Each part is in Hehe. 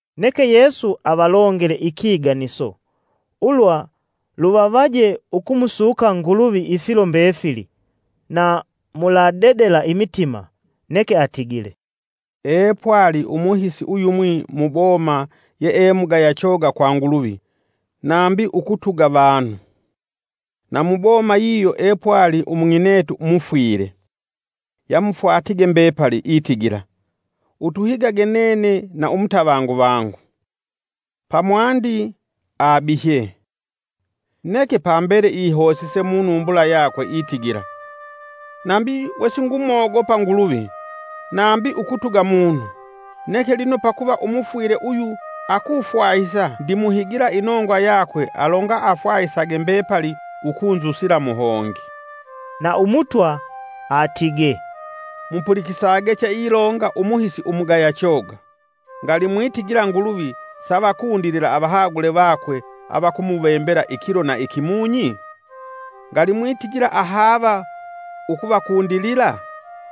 Neke Yesu avalongele ikiganiso, ulwa luvavaje ukumusuka Nguluvi ifilo mbefili, na muladedela imitima. Neke atigile “Epwali umuhisi uyumwi mu boma yee mugaya choga kwa Nguluvi nambi ukutuga vanu. Na mu boma yiyo epwali umung'inetu mufwile, yamufwatige mbepali, itigila, utuhigage nene na umutavangu vangu. Pamwandi abihye, neke pambele ihosise munumbula yakwe itigila, ‘Nambi we singumogopa Nguluvi nambi ukutuga munu, neke lino pakuva umufwile uyu akufwahisa, ndimuhigila inongwa yakwe alonga afwahisage mbepali ukunzusila muhongi.’” Na Umutwa atigee, “Mupulikisage cheilonga umuhisi umugaya choga. Ngali mwitigila Nguluvi savakundilila avahagule vakwe avakumuvembela ikilo na ikimunyi? Ngali mwitigila ahaava ukuvakundilila?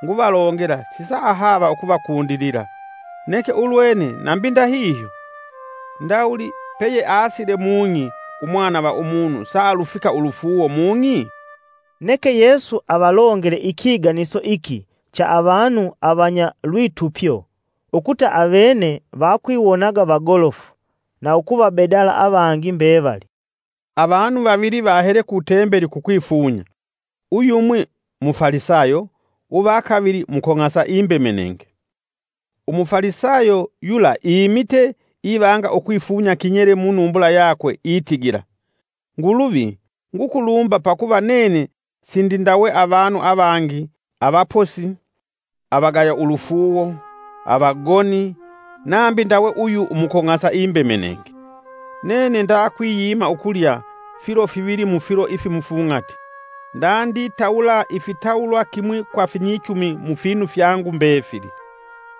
Nguvalongela sisaahava ukuvakundilila. Neke ulwene nambi ndahihyo, ndawuli peyeasila mung'i Umwana va Umunu, saalufika ulufuuwo mung'i!?” Neke Yesu avalongele ikiganiso iki cha avanu avanya lwitupyo ukuta awene vakwiwonaga vagolofu na ukuvabedala avangi mbevali. “Avanu vavili vahele ku tembeli kukwifunya: uyumwi Mufalisayo uvakavili Mukong'asa imbemenenge. Umufalisayo yula imite ivanga ukwifunya kinyele munumbula yakwe itigila, ‘Nguluvi, ngukulumba pakuva nene sindindawe avanu avangi avaposi, avagaya ulufuuwo, avagoni, nambi ndawe uyu umukong'asa imbemenenge. Nene ndakwiyima ukulya filo fivili mufilo ifimufung'ati, ndatwitawula ifitawulwa kimwi kwa finyichumi mufinu fyangu mbefili.’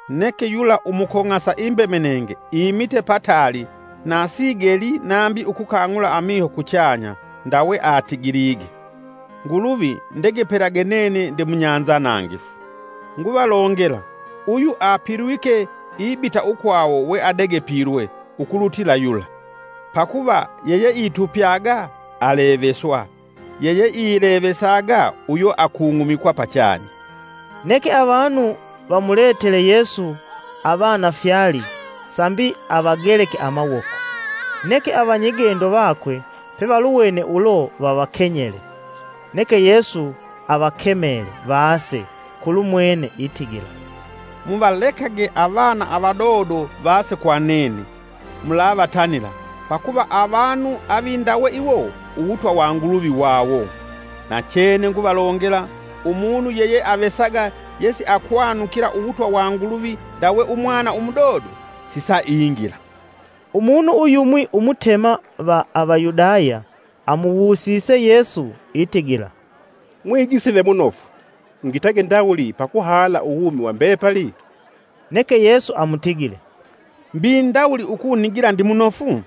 Neke yula umukong'asa imbemenenge, imite pataali na sigelii nambi ukukang'ula amiho kuchanya, ndawe atigilige, ‘Nguluvi, ndegepelage nene ndemunyanzanangifu.’ Nguvalongela, uyu apilwike ibita ukwawo we adegepilwe, ukulutila yula. Pakuva yeyeitupyaga aleveswa yeyeilevesaga uyo akung'umikwa pachanya.” Neke avanu vamuletele Yesu avana fyali sambi avageleke amawoko. Neke avanyigendo vakwe pevaluwene ulo vavakenyele. Neke Yesu avakemele vase kulumwene, itigila; “Muvalekage avana avadodo vase kwa nene, mulavatanila, pakuva avanu avindawe iwo uwutwa wa Nguluvi wawo. Nachene nguvalongela, umunu yeyeavesaga yesiakwanukila uwutwa wa Nguluvi ndawe umwana umudodo sisaingila.” Umunu uyumwi umutema va Avayudaya, amuwusise Yesu itigila, “Mwigisi ve munofu, ngitage ndawuli pa kuhala uwumi wa mbepali?” Neke Yesu amutigile, “Mbi ndawuli ukunigila ndimunofu?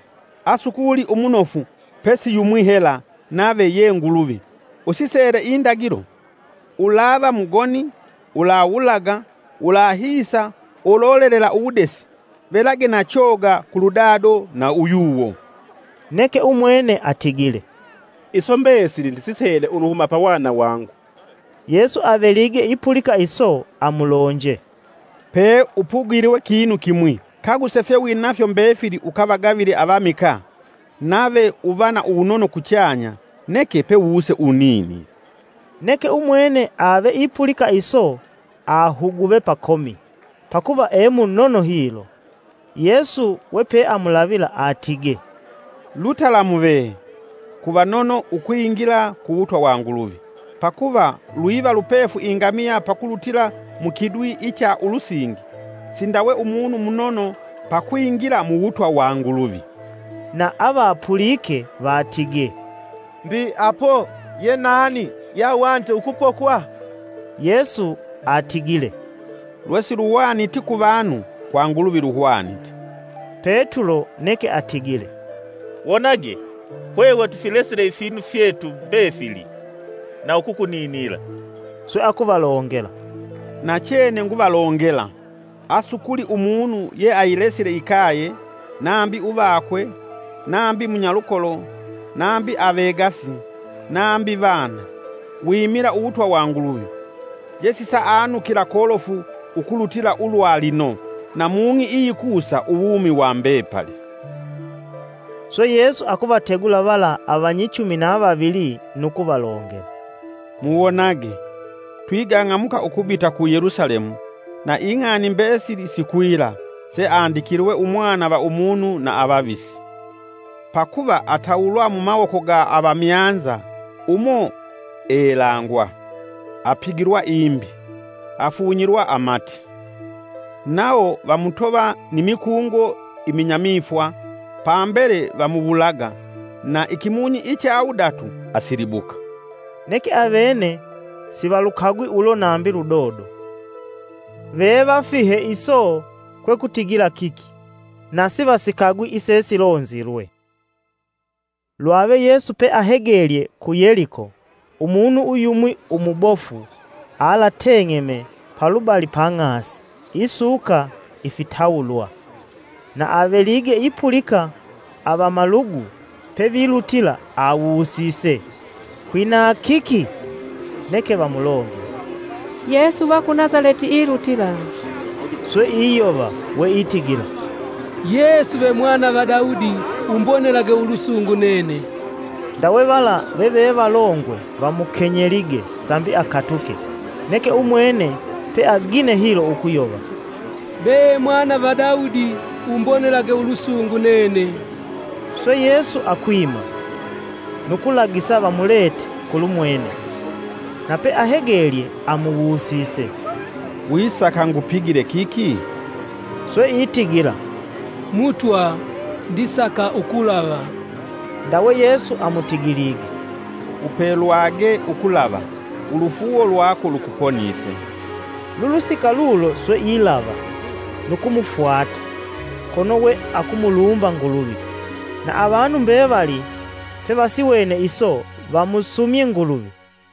Asukuli umunofu pesi yumwi hela, nave ye Nguluvi. Usisele Indagilo: ‘Ulava mugoni; ulawulaga, ulahisa, ulolelela uwudesi; velage na choga kulu dado na uyuwo.’” Neke umwene atigile, “Iso mbesili ndisisele uluhuma pa wana wangu.” Yesu avelige ipulika iso amulonje, “Peupugilwe kinu kimwi, kaguse fyewinafyo mbefili ukavagavile avamikaa, nave uva na uwunono kuchanya, neke pewuse uninile.” Neke umwene ave ipulika iso ahuguve pakomi, pakuva e munono hilo. Yesu we peamulavila atigee, “Lutalamu vee kuvanono ukwingila ku wutwa wa Nguluvi! Pakuva lwiva lupefu ingamiya pakulutila mukidwi icha ulusingi, sindawe umunu umunono pakwingila mu wutwa wa Nguluvi.” Na avapulike vatigee, “Mbi apo ye nani, yeahwanite ukupokwa?” Yesu atigile, “Lwesiluhwaniti ku avanu kwa Nguluvi luhwanite.” Petulo neke atigile, “Wonage hwehwe tufilesile ifinu fyetu mbefili na ukukuninila!” Swe akuvalongela, “Nachene nguvalongela, asukuli umunu yeayilesile ikaye, nambi uvakwe, nambi munyalukolo, nambi avegasi, nambi vana, wimila uwutwa wa Nguluvi, yesisaanukila kolofu ukulutila ulwa lino; na mung'i iyikusa uwumi wa mbepali.” Swe Yesu akuvategula vala avanyichumi na vavili, nu kuvalongela, “Muwonage! Twigang'amuka ukubita ku Yelusalemu, na ing'ani mbesili sikwila, seandikilwe Umwana va Umunu na avavisi. Pakuva atawulwa mumawoko ga avamyanza umo elangwa, apigilwa imbi, afunyilwa amati. Nawo vamutova ni mikungo iminyamifwa, pambele vamuwulaga, na ikimunyi icha wudatu asilibuka.” Neke avene sivalukagwi ulo nambi ludodo, vevafihe iso kwekutigila kiki, na sivasikagwi isesilonzilwe. Lwave Yesu peahegelye ku Yeliko, umunu uyumwi umubofu alateng'eme palubali pang'asi isuka ifitawulwa. Na avelige ipulika avamalugu pevilutila awusise, “Kwina kiki?” Neke vamulongele, “Yesu uva ku Nasaleti ilutila.” Swe iyova weitigila, “Yesu ve mwana va Daudi, umbonelage ulusungu nene!” Ndawe vala veve valongwe vamukenyelige sambi akatuke, neke umwene peagine hilo ukuyova: “Be mwana va Daudi umbonelage ulusungu nene.” Swe Yesu akwima, nu kulagisa vamulete kulumwene. Na peahegelye amuwusise, “Wisaka ngupigile kiki?” Swe itigila, “Mutwa, ndisaka ukulava.” Ndawe Yesu amutigilige, “Upelwage ukulava! Ulufuuwo lwako lukuponise.” Lulusika lulo swe ilava, nu kumufwata, kono we akumulumba Nguluvi. Na avanu mbevali pevasiwene iso vamusumye Nguluvi.